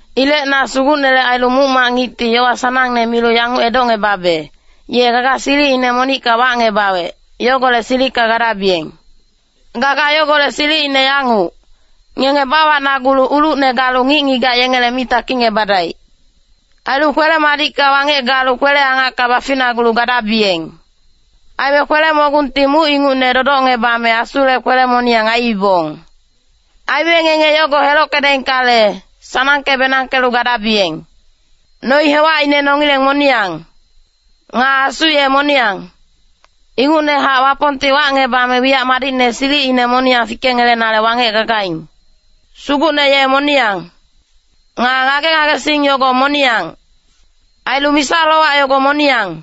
Ilec na Sugucnele ailu muc-mac ngicti yowa sanangne milu yanguc edocngebabe, ye gaga silicine monicka wacngebawec, yogolec silicka gadabiyeng. Gaga yogolec silicine yanguc, ngenge bawacnagulu ulucne galu ngic-ngigac yengele mi takicngebadaic. Ailu kwele-madicka wangec galu kwele-angacka baficnagulu gadabiyeng. Aime kwele-mogungti muc ingucne dodocngebame Asule kwele-moniyang aiibong. Aime ngenge yogo helockedaingkale, sanangke-benangkelu gadabiyeng. Noi-hewacine nongileng moniyang. Nga Asu ye moniyang. Ingucnehac Wapongti wacngebame wiyac madicne silicine moniyang fikengelenale wangec gagaing. Sugucne ye moniyang. Nga ngage-ngagesing yogo moniyang. Ailu misa-lowac yogo moniyang.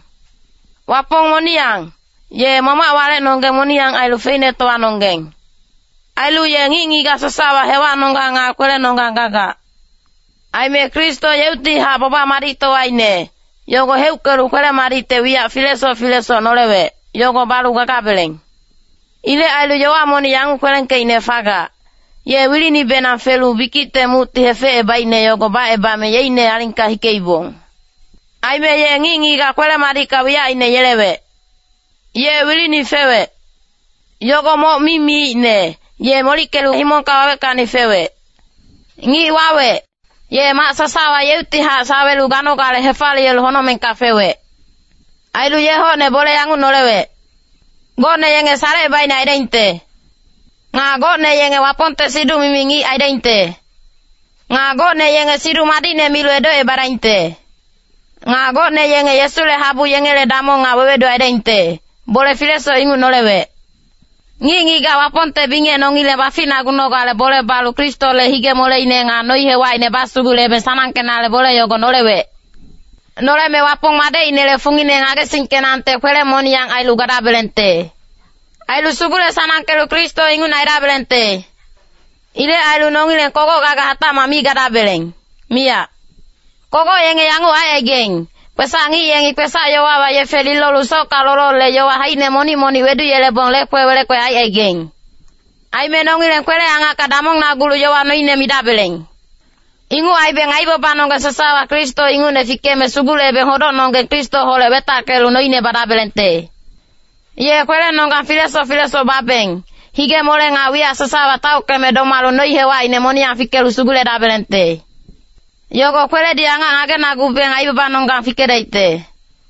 Wapong moniyang, ye Mamac walecnonggeng moniyang ailu feicnetowanonggeng. Ailu ye ngic-ngigac sasawa hewacnonggang nga kwelenonggang gagac. Aime Kristo yeuctihac baba-madictowaine, yogo heuckelu kwele-madicte wiyac filesoc filesoc nolewec, yogo balu gagabeleng. Ilec ailu yowa monic yanguc kwelengkeicne fagac, “Ye wilinibenang felu bikicte mucti hefecebaicne yogo bacebame yeicne alingka hikeibong. Aime ye ngic-ngigac kwele-madicka wiyacine yelewec.” Ye wilini fewec. Yogo moc mi miicne, ye molickelu himongka waweckacni fewec. Ngic wawec, ye mac sasawa yeuctihac sawelu ganogale hefaliyelu honocmengka fewec. Ailu ye hocne bole yanguc nolewec. Gocne yenge salecebaicne aidaingte. Nga gocne yenge Wapongte siduc-mimi ngic aidaingte. Nga gocne yenge Siduc Madicne milu edocebadaingte. Nga gocne yenge Yesule habu yengele damong nga wewedu aidaingte, bole filesoc inguc nolewec. Ngic-ngigac Wapongte bingec nongileng baficnagunogale bole balu Kristole hige-moleine nga noi-hewacine basugulebeng sanangkenale bole yogo nolewec. Noleme Wapong madecinele fungine ngagesingkenangte kwele-moniyang ailu gadabelengte. Ailu sugule-sanangkelu Kristo ingucne aidabelengte. Ilec ailu nongileng kogoc gaga hatacmac mi gadabeleng, miyac. Kogoc yenge yanguc aicaigaing, kwesac-ngic yengi kwesac-yowawa yefe lilolu socka lolole-yowa haicine monic-monic weduyelebong lekwe wele-kwe aicaigaing. Aime nongileng kwele-angacka damongnagulu yowa noine midabeleng. Inguc aibeng aibabanonggeng sasawa Kristo ingucne fikeme sugulebeng hodocnonggeng Kristoholec wetackelu noine badabelengte. Ye kwelenonggang filesoc filesoc babeng, hige-mole nga wiyac sasawa taockeme domalu noi-hewacine moniyang fikelu suguledabelengte. Yogo kweledi angac ngagenagubeng aibabanonggang fikedaicte.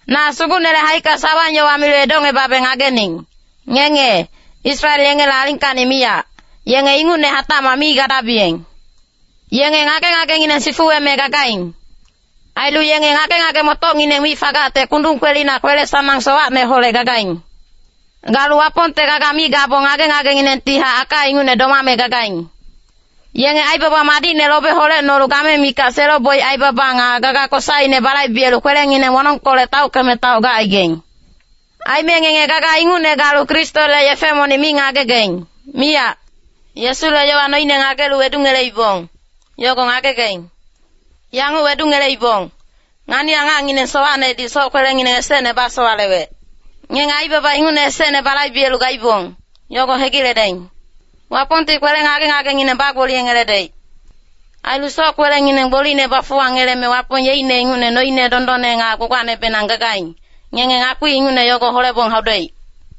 Na Sugucnele haicka sawang-yowa milu edocngebabe ngagening, ngenge, Israel yengele alingkacni miyac, yenge ingucne hatacmac mi gadabiyeng. Yenge ngage-ngagengineng sifuweme gagaing. Ailu yenge ngage-ngage-motocngineng mi fagacte kundung kwelina kwele-sanang sowacneholec gagaing. Galu Wapongte gaga mi gabong ngage-ngagenginengtihac aka ingucne domame gagaing. Yenge aibaba madicne lobe holecnolu game mikac selo-boic aibaba nga gaga kosaine balaibelu kwelengineng wonongkolec taockeme taoc gacaigaing. Aime ngenge gaga ingucne galu Kristole yefe monic mi ngagegaing, miyac. Yesule yowa noine ngagelu wedungeleibong, yogo ngagegaing. Yanguc wedungeleibong, ngani-angacngineng sowacnedi soc-kwelengineng esecne basowalewec. Ngenge aibaba ingucne esecne balaibelu gaibong, yogo hegiledaing. Wapongti kwele ngage-ngagengineng bagboliyengeledaic. Ailu soc-kwelengineng gbolicne bafuwangeleme Wapong yeicne ingucne noine dondonne nga gbagbacnebenang gagaing, ngenge ngakpi ingucne yogo holebong haudaic.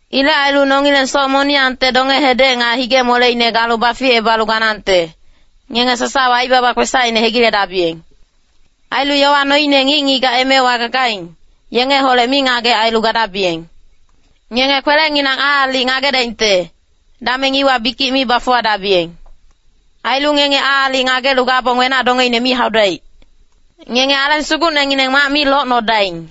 Ilec ailu nongileng soc moniyangte donge-hedec nga hige-moleine galu baficebalu ganangte, ngenge sasawa aibaba kwesacine hegiledabiyeng. “Ailu yowa noine ngic-ngigac emewa gagaing, yengeholec mingagec ailu gadabiyeng.” “Ngenge kwelenginang aalic ngagedaingte, dameng iwa bikic mi bafuwadabiyeng.” Ailu ngenge aalic ngagelu gabong wenac-dongeine mi haudaic. Ngenge Aleng Sugucnengineng mac mi locnodaing.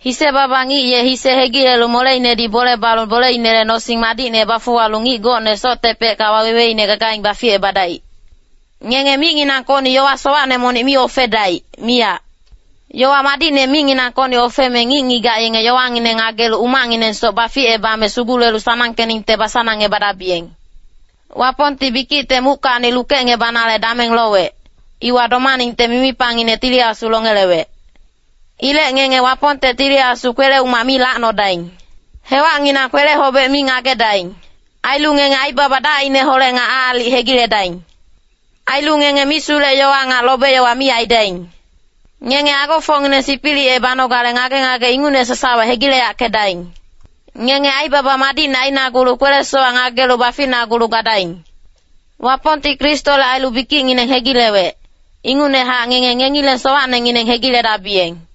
Hise-baba ngic ye hise hegilelu moleinedi bole balu boleinele nosing madicne bafuwalu ngic gocne soctepecka waweweine gagaing baficebadaic. Ngenge micnginangkocni yowa sowacne monic mi ofedaic, miyac. Yowa madicne micnginangkocni ofeme ngic-ngigac yenge yowangineng ngagelu umacnginengsoc baficebame sugulelu sanangkeningte basanangebadabiyeng. Wapongti bikicte muckacni lukecngebanale dameng lowec, iwa domaningte mimipangine Tili Asu longelewec. Ilec ngenge Wapongte Tili Asu kwele-umac mi lacnodaing. Hewacnginang kwele-hobec mi ngagedaing. Ailu ngenge aibaba dacineholec nga aalic hegiledaing. Ailu ngenge misulec-yowa nga lobe-yowa mi aidaing. Ngenge agofocngineng sipilicebanogale ngage-ngage ingucne sasawa hegileyackedaing. Ngenge aibaba madicne ainagulu kwele-sowac ngagelu baficnagulu gadaing. Wapongti Kristole ailu bikicngineng hegilewec, ingucnehac ngenge ngengileng sowacnengineng hegiledabiyeng.